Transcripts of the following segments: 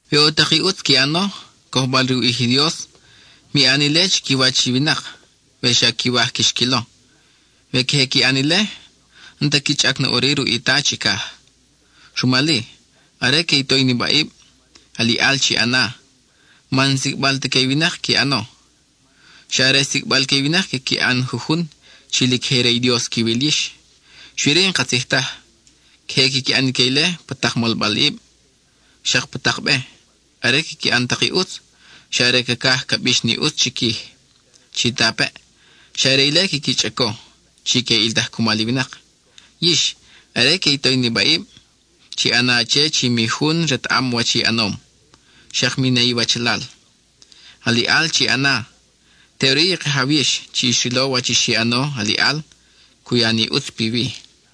We ʼo tak i ʼutz qui ʼano, cojbal-re u ʼij i Dios, mi ʼan ile chiquiwach i winak we xa quiwaj quix quilo. We queje qui ʼan ile, n-ta qui chʼac na ʼuri ruʼ i Ta chicaj. Rumal-i, are que i to i nibaʼib, aliʼal chi ʼana, man n-sicʼbal ta que i winak qui ʼano. Xa are sicʼbal que i winak quiqui ʼan jujun, chi lic je re i Dios quiwil yix, xui-ri, n-katzij taj. Queje quiqui ʼan ique ile pa tak molbalʼib, xak pa tak be. Are quiqui ʼan tak i ʼutz, xa are cacaj ca bix ni ʼutz chiquij. Chitapeʼ, xa are ile quiqui chʼaco, chi que ʼiltaj cumal i winak. Yix, are que i to i nibaʼib, chi ʼana che chi mi jun retaʼam wach i ʼanom, xak mi ne iwachalal. Aliʼal chi ʼana; teʼuri i Kajaw yix chi xrilo wach xi ʼano aliʼal, cu ya ni ʼutz piwi.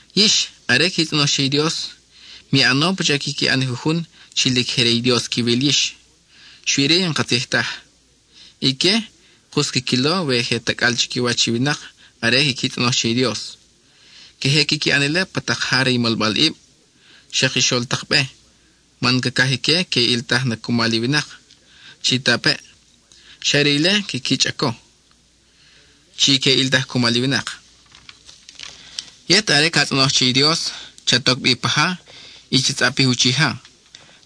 Yix, are qui tzʼonoj che i Dios, mi ʼano pacha quiqui ʼan i jujun chi lic je re i Dios quiwil yix, xui-ri n-katzij taj. Ique, kus quiquilo we je tacʼal chiquiwach i winak are quiqui tzʼonoj che i Dios. Queje quiqui ʼan ile pa tak ja re i molbalʼib, xak i xol tak be, man cacaj ique que ʼiltaj na cumal i winak. Chitapeʼ, xa are ile quiqui chʼaco, chi que ʼiltaj cumal i winak. Yet, are ca tzʼonoj che i Dios, chat oc bi pa ja y cha tzʼapij uchija.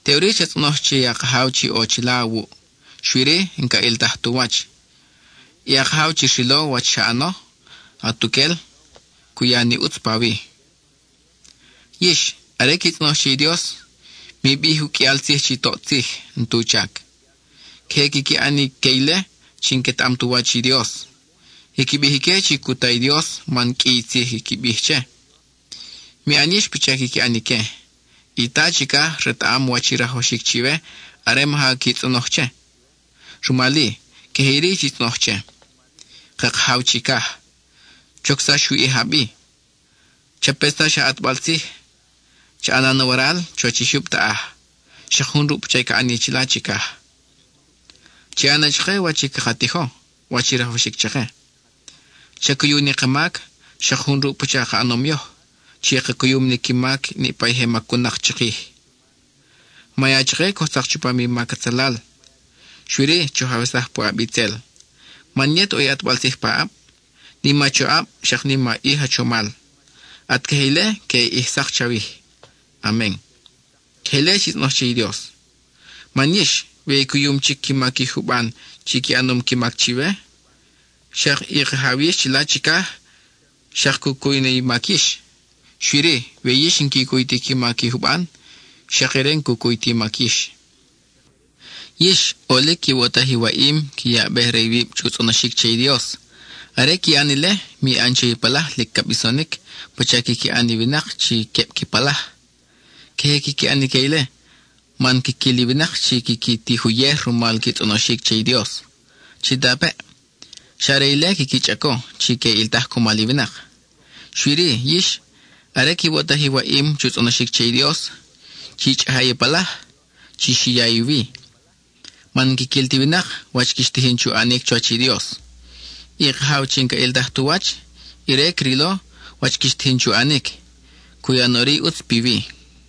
Teʼuri cha tzʼonoj che a Kajaw chi ʼo chila awuʼ, xui-ri, n-ca ʼiltaj tu wach. Y a Kajaw chi xrilo wach xa ʼano atuquel, cu ya ni ʼutz pawi. Yix, are qui tzʼonoj che i Dios, mi bij uqʼuial tzij chi toʼ tzij, n-tu chac. Queje quiqui ʼan ique ile chi n-quetaʼam tu wach i Dios. Quiqui bij ique chi cu ta i Dios man qʼui i tzij quiqui bij che. Mi ʼan yix pacha quiqui ʼan ique; i Ta chicaj retaʼam wach i rajwaxic chiwe are maja qui tzʼonoj che. Rumal-i, queje iri chi tzʼonoj che: Ka Kajaw chicaj, chocsax u ʼij a bi. Chapetsax a ʼatbal tzij, cha ʼana na waral chuwach i jyub taʼaj, xak jun ruʼ pacha i ca ʼani chila chicaj. Cha ya na chake wach i caka tijo, wach i rajwaxic chake. Cha cuyu ni ka mac, xak jun ruʼ pacha ka ʼanom yoj, chi ka cuyum ni qui mac niʼpa i je macun-nak chikij. Ma ya chake coj tzak chupam i mac atzalal, xui-ri choj awesaj puʼab itzel. Man yet ʼo i ʼatbal tzij paʼab; nim a choʼab, xak nim a ʼij a chomal. At queje ile queʼe ʼij sak chawij. Amen. (Queje ile chi tzʼonoj che i Dios.) Man yix, we i cuyum chic qui mac i juban chi qui ʼanom qui mac chiwe, xak i Kajaw yix chila chicaj xak cu cuy na i mac yix. Xui-ri, we yix n-qui cuy ti qui mac i juban, xak ire n-cu cuy ta i mac yix. Yix, ʼolic quiwoʼtaj i waʼim qui yabej-re iwib chu tzʼonoxíc che i Dios. Are qui ʼan ile, mi ʼan che i palaj lic ca bisonic pacha quiqui ʼan i winak chi queb qui palaj. Queje quiqui ʼan ique ile, man quiquil i winak chi quiqui tij uyej rumal qui tzʼonoxic che i Dios. Chitapeʼ, xa are ile quiqui chʼaco chi que ʼiltaj cumal i winak. Xui-ri, yix, are quiwoʼtaj i waʼim chu tzʼonoxic che i Dios, chi chʼaja i palaj, chi xiya i wi, man n-quiquil ti winak wach quix tijin chu ʼanic chuwach i Dios. I Kajaw chi n-caʼiltaj tu wach, ire crilo wach quix tijin chu ʼanic; cu ya na ʼuri i ʼutz piwi.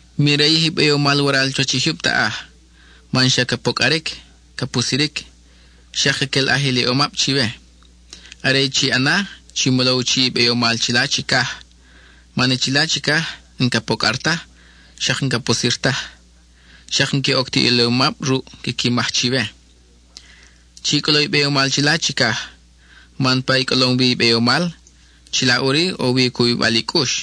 Mi rayij i beyomal waral chuwach i jyub taʼaj, man xa ca pocʼaric, ca pusiric, xak caquelʼaj iliʼomab chiwe. Are i chi ʼana, chi molo u chiʼ i beyomal chila chicaj, man i chila, n-ca pocʼar taj, xak n-ca pusir taj, xak n-que oc ti iliʼom ruʼ quiqui maj chiwe. Chi cʼolo i beyomal chila chicaj, man pa i cʼolom wi i beyomal, chila ʼuri ʼo wi u cubibal i cʼux.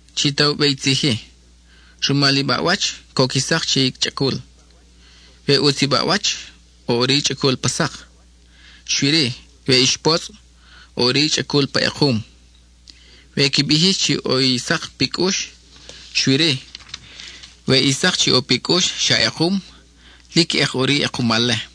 (Chi ta u be i tzij-i:) Rumal i baʼwach, coc i sak che i chʼacul. We ʼutz i baʼwach, ʼo ʼuri i chʼacul pa sak. Xui-ri, we ix potzʼ, ʼo ʼuri i chʼacul pa ekum. We qui bij yix chi ʼo i sak pi cʼux, xui-ri, we i sak chi ʼo pi cʼux xa ʼekum, lic ʼek ʼuri i ʼekumal-le.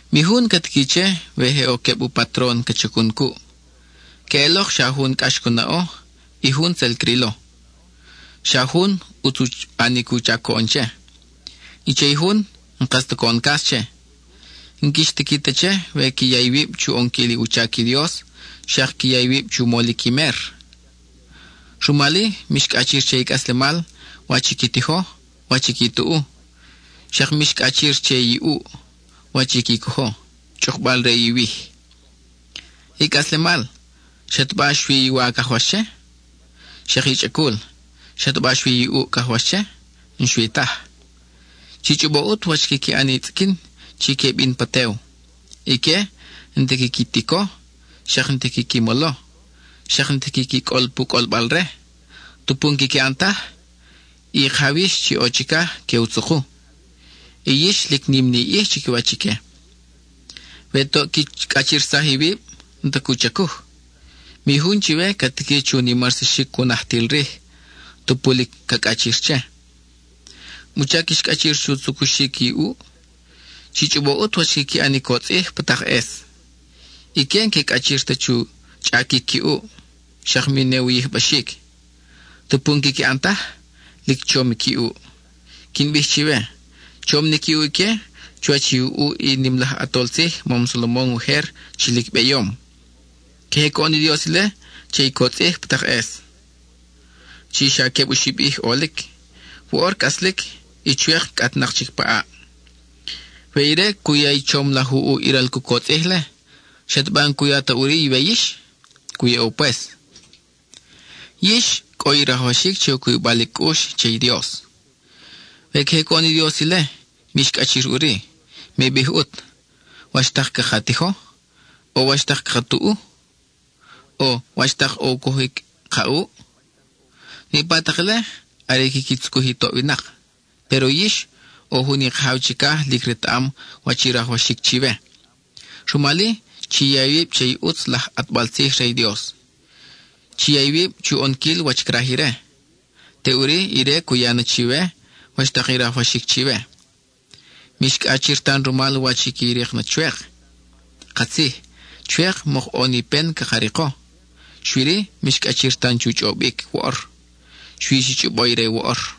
Mi jun ca tiqui che, we je ʼo queb u patron ca chacun cuʼ. Queʼelok xa jun cʼax cu naʼo, y jun tzel crilo. Xa jun, ʼutz u ʼanic u chac coʼon che; y che i jun, n-kas ta coʼon cas che. N-quix tiqui ta che, we qui ya iwib chu ʼonquil u chac i Dios, xak qui ya iwib chu molic i mer. Rumal-i, mix cʼachir che i cʼaslemal, wach i qui tijo, wach i qui tuʼu; xak mix cʼachir che i ʼuʼ, wach i qui cojo, chʼukbal re iwij. I cʼaslemal, ¿xataba xui i wa cajwax che? Xak i chʼacul, ¿xataba xui i ʼuʼ cajwax che? N-xui taj. Chi chʼobo ʼut wach quiqui ʼan i tzʼiquin chi que bin pa tew. Ique, n-ti quiqui tico, xak n-ti quiqui molo, xak n-ti quiqui cʼol pu cʼolbal-re. Tupu n-quiqui ʼan taj, i Kajaw yix chi ʼo chicaj que u tzuku. Y yix lic nim ni i ʼij chiquiwach ique. We toʼ qui cʼachirsaj iwib, n-ta cu chacuj. Mi jun chiwe ca tiqui chu nimarsaxic u najtil rij, tupu lic ca cʼachir che. ¿Wuchac quix cʼachir chu tzucuxic i ʼuʼ? Chi chʼobo ʼut wach quiqui ʼan i cotzʼij pa tak ʼes. Ique n-que cʼachir ta chu chʼaquic qui ʼuʼ, xak mi ne u yijbaxic. Tupu n-quiqui ʼan taj, lic chom qui ʼuʼ. Quin bij chiwe, chom ni qui ʼuʼ ique chuwach i u ʼuʼ i nim laj ʼatol tzij mam Salomon ujer chi lic beyom. Queje coʼon i Dios ile che i cotzʼij pa tak ʼes, chi xa queb oxib ʼij ʼolic: woʼor cʼaslic, y chwek cʼatnak chic pa ʼaʼ. We ire cu ya i chom laj u ʼuʼ i ral cu cotzʼij-le, ¿xataba n-cu ya ta ʼuri iwe yix? Cu yaʼo pues. ¡Yix cʼo i rajwaxic che u cubibal i cʼux che i Dios! We queje coʼon i Dios ile, mix cʼachir ʼuri; mi bij ʼut, “¿Wach tak caka tijo? o ¿wach tak caka tuʼu? o ¿wach tak u cojic ka ʼuʼ?” Niʼpa tak ile, are i quiqui tzucuj i toʼ winak. Péro yix, ʼo jun i Kajaw chicaj lic retaʼam wach i rajwaxic chiwe. Rumal-i, chi ya iwib che i ʼutz laj ʼatbal tzij re i Dios; chi ya iwib chu ʼonquil wach craj ire; teʼuri ire cu ya na chiwe wach tak i rajwaxic chiwe. Mix cʼachir tan rumal wach i qui rik na chwek. Katzij, chwek mok ʼo ni pen caka riko, xui-ri, mix cʼachir tan chu chʼobic woʼor; xui chi chʼobo i re woʼor.